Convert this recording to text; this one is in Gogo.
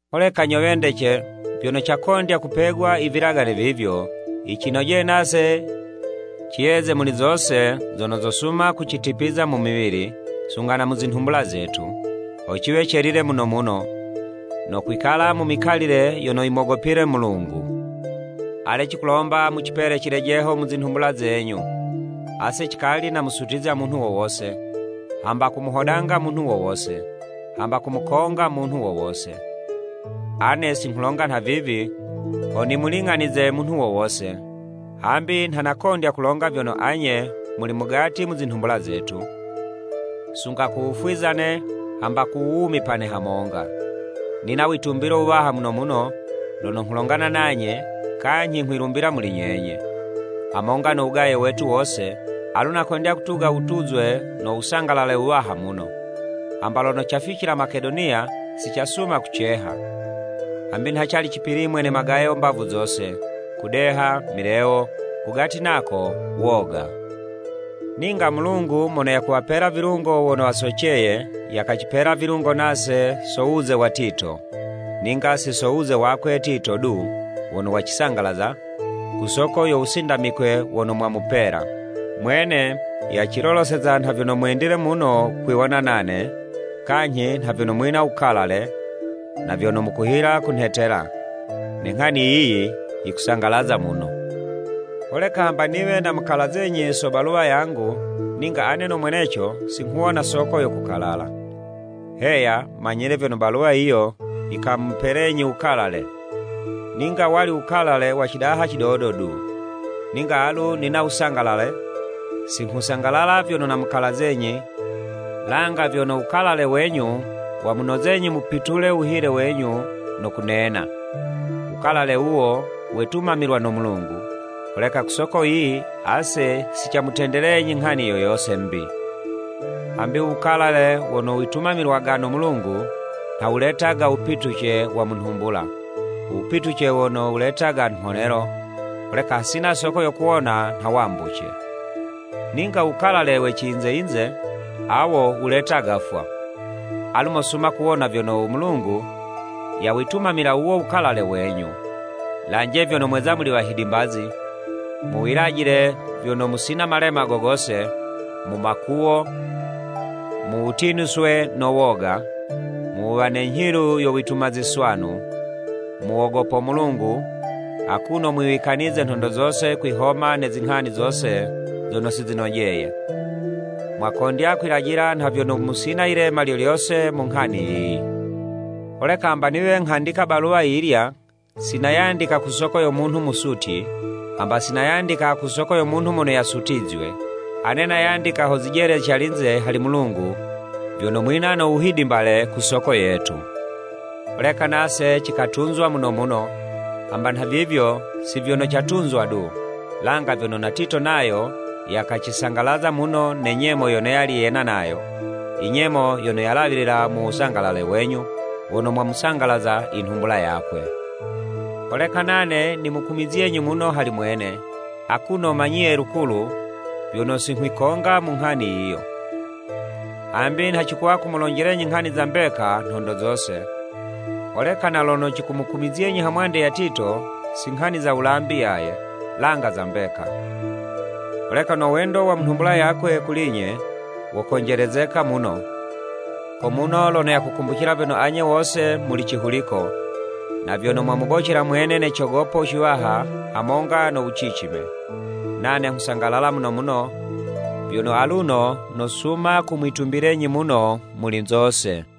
Holeka nyo wendece, vyono cakondya kupegwa i vilagane vivyo, yicinojeye nase ciyeze muli zose zono zosuma kucitipiza mu miwili, sunga na mu zinhumbula zetu, ho ciwe celile muno muno, no kwikala mu mikalile yono yimogopile Mulungu. Ale cikulomba mu cipele cilejeho mu zinhumbula zenyu! Ase cikali namusutizya munhu wo wose, hamba ku muhodanga munhu wo wose, hamba kumukonga munhu wo wose. Ane si nghulonga nhavivi ho nimuling'anize munhu wo wose, hambi nha nakondya kulonga vyono anye muli mugati mu zinhumbula zetu, sunga ku wufwizane, hamba ku wuwumipane hamonga. Nina witumbilo wuwaha muno muno, lono nghulongana nanye, kanyhi nghwilumbila muli nyenye! Hamonga no wugaye wetu wose, alu nakondya kutuga wutuzwe no wusangalale wuwaha muno. Hamba lono caficila Makedoniya, si casuma kuceha, hambi nha cali cipilimwe ne magayo mbavu zose, kudeha, milewo, kugati nako woga. Ninga Mulungu mono yakuwapela vilungo wono wasoceye, yakacipela vilungo nase so wuze wa Tito. Ninga si so wuze wakwe Tito du wono wacisangalaza, ku soko yo wusindamikwe wono mwamupela. Mwene yaciloloseza nha vyono mwendile muno kwiwona nane, kanyhi na vyono mwina wukalale, na vyono mukuhila kunhetela. Ne nghani yiyi yikusangalaza muno. Holeka hamba niwe namukalazenyi so baluwa yangu, ninga ane no mweneco si nghuwona soko yo kukalala. Heya, manyile vyono baluwa yiyo yikamupelenyi wukalale, ninga wali wukalale wa cidaha cidodo du. Ninga alu nina wusangalale, singhusangalala vyono namukalazenyi, langa vyono wukalale wenyu wamunozenyi mupitule wuhile wenyu no kunena. Wukalale wuwo wetumamilwa no Mulungu, holeka ku soko yiyi ase si camutendelenyi nghani yo yose'mbi. Hambi u wukalale wono witumamilwaga no Mulungu, nha wuletaga wupituce wa mu nhumbula, u wupituce wono wuletaga mhonelo, holeka hasina soko yo kuwona nha wambuce. Ninga u wukalale we ciyinze-yinze, awo wuletaga 'fwa. Alu mosuma kuwona vyono u Mulungu yawitumamila wuwo u wukalale wenyu. Lanje vyono mweza muli wahidimbazi, mu wilajile vyono musina malema go gose, mu makuwo, mu wutinuswe no woga, mu wuwa ne nyhilu yo wituma ziswanu, mu wogopo Mulungu, akuno mwiwikanize nhondo zose kwihoma ne zinghani zose zono si zinojeye. Mwakondya kwilajila nha vyono musina yilema lyo lyose mu nghani yiyi. Holeka hamba niwe nghandika baluwa yiyilya, si nayandika ku soko yo munhu musutyi, hamba si nayandika ku soko yo munhu mono yasutizywe. Ane nayandika ho zijele calinze hali Mulungu vyono mwina no wuhidimbale ku soko yetu. Holeka nase cikatuzwa muno muno. Hamba nhavivyo, si vyono catuzwa du, langa vyono na Tito nayo yakacisangalaza muno ne nyemo yono yali yena nayo, i nyemo yono yalawilila mu wusangalaze wenyu wono mwamusangalaza inhumbula yakwe. Holeka nane nimukumizyenyi muno hali mwene, akuno manyiye lukulu, vyono si nghwikonga mu nghani yiyo. Hambi nha cikuwa kumulonjelenyi nghani za mbeka nhondo zose, holeka na lono cikumukumizyenyi ha mwande ya Tito, si nghani za wulambi yaye, langa za mbeka. Holeka no wendo wa mu nhumbula yakwe kuli'nye, wokonjelezeka muno, ko muno lono yakukumbucila vyono anye wose muli cihuliko, na vyono mwamubocela mwene ne cogopo ciwaha hamonga no wucicime. Nane nghusangalala muno muno vyono aluno nosuma kumwitumbilenyi muno muli zose.